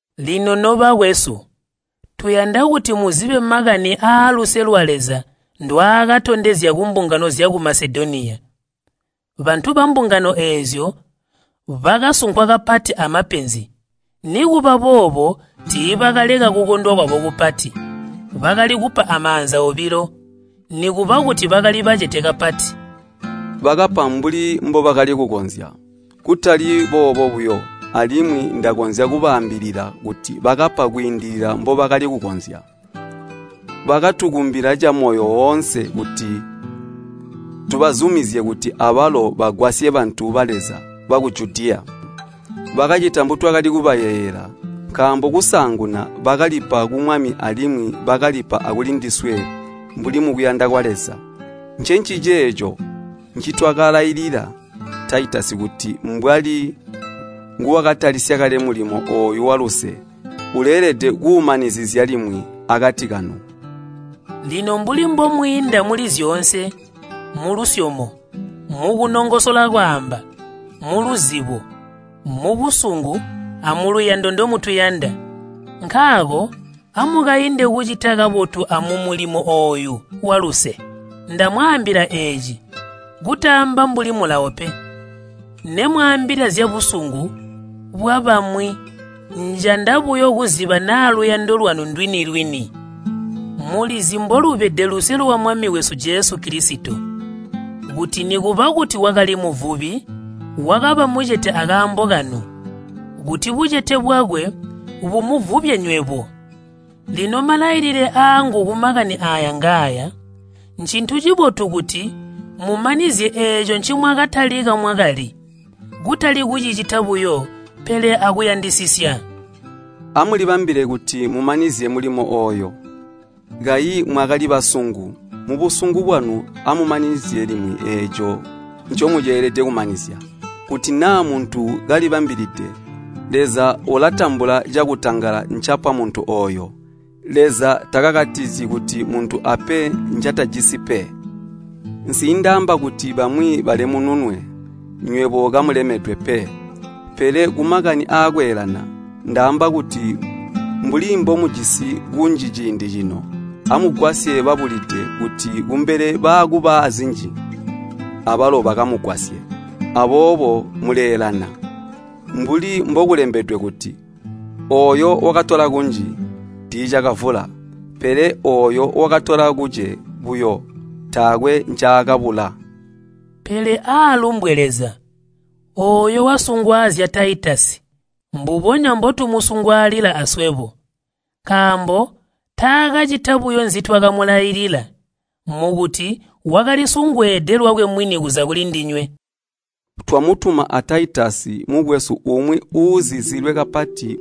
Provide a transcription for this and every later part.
Lino nobakwesu, tuyanda kuti muzibe makani aaluse lwa Leza ndwaakatondezya kumbungano zyaku Masedoniya. Bantu bambungano eezyo bakasunkwa kapati amapenzi, nikuba boobo tiibakaleka kukondwa kwabo kupati. Bakali kupa amaanza obilo, nikuba kuti bakali bacete kapati. Bakapa mbuli mbobakali kukonzya, kutali boobo buyo, alimwi ndakonzya kubaambilila kuti bakapa kwiindilila mbobakali kukonzya. Bakatukumbila camoyo woonse kuti tubazumizye kuti abalo bagwasye bantu ba Leza baku Judiya. Bakacita mbutwatakali kubayeeyela, nkaambo kusaanguna bakalipa ku Mwami alimwi bakalipa akulindiswe mbuli mukuyanda kwa Leza. Ncenciceeco ncitwakalailila Taitasi kuti mbwali nguwakatalisya kale mulimo ooyu waluse, uleelede kuumanizizya limwi akati kanu. Lino mbuli mbomwiinda muli zyoonse, mulusyomo, mukunongosola kwaamba, muluzibo, mubusungu amuluyando ndomutuyanda, nkaako amukainde kucita kabotu amumulimo ooyu waluse. Ndamwaambila eeci kutaamba mbuli mulawo pe. Nemwaambila zyabusungu bwabamwi njanda buyo kuziba naa luyando lwanu ndwini-lwini. Mulizi mbolubede luse lwa Mwami wesu Jesu Kilisito, kuti nikuba kuti wakali muvubi, wakaba mucete akaambo kanu, kuti bucete bwakwe bumuvubye nywebo. Lino malailile aangu kumakani aaya ngaaya, ncintu cibotu kuti mumanizye eeco ncimwakatalika mwakali, kutali kucicita buyo, pele akuyandisisya. Amulibambile kuti mumanizye mulimo ooyo. Kayi mwakali basungu, musungu bwanu amumanizizye limwi eeco ncomuceelede kumanizya. Kuti naa muntu kalibambilide, Leza ulatambula cakutangala ncapa muntu ooyo, Leza takakatizyi kuti muntu ape ncatajisi pe. Nsiindaamba kuti bamwi balemununwe, nywebo kamulemedwe pe. Pele kumakani akweelana, ndaamba kuti mbuli mbomujisi kunji ciindi cino, amugwasye babulide kuti kumbele baakuba aazinji abalo bakamugwasye. Aboobo muleelana. Mbuli mbokulembedwe kuti, “Ooyo wakatola kunji, tiicakavula, pele ooyo wakatola kuce buyo, taakwe ncaakabula.” Pele aalumbwe Leza, ooyo wasungwaazya Taitasi mbubonya mbotumusungwaalila aswebo. Nkaambo taakacita buyo nzitwakamulailila, mukuti wakalisungweede lwakwe mwini kuza kulindinywe. Twamutuma a Taitasi mukwesu umwi uuzizilwe kapati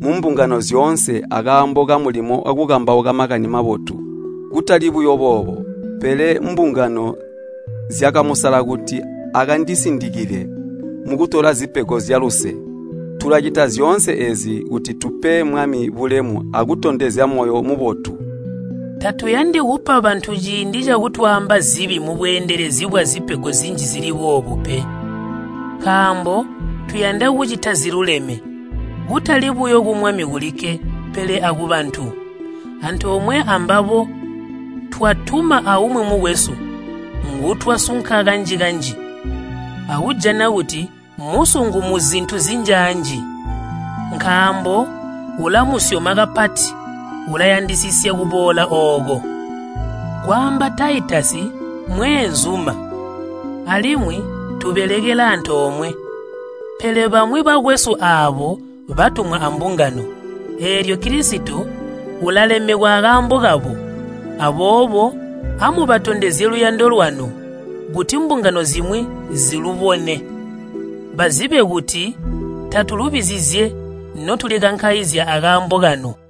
mumbungano zyoonse akaambo kamulimo wakukambauka Makani Mabotu. Kutali buyo boobo, pele mbungano zyakamusala kuti akandisindikile mukutola zipego zyaluse. Tulacita zyoonse eezi kuti tupe Mwami bulemu akutondezya moyo mubotu. Tatuyandi kupa bantu ciindi cakutwaamba zibi mubweendelezi bwazipego zinji zili boobu pe. Nkaambo tuyanda kucita ziluleme, kutali buyo ku Mwami kulikke, pele akubantu. Antoomwe ambabo twatuma aumwi mukwesu, ngutwasunka kanji-kanji akujana kuti mmusungu muzintu zinjaanji. Nkaambo ulamusyoma kapati ulayandisisya kuboola ooko. Kwaamba Taitasi mmweenzuma, alimwi tubelekela antoomwe. Pele bamwi bakwesu aabo batumwa ambungano, eelyo Kilisito ulalemekwa akaambo kabo. Aboobo amubatondezye luyando lwanu, kuti mbungano zimwi zilubone. Bazibe kuti tatulubizizye notulikankaizya akaambo kanu.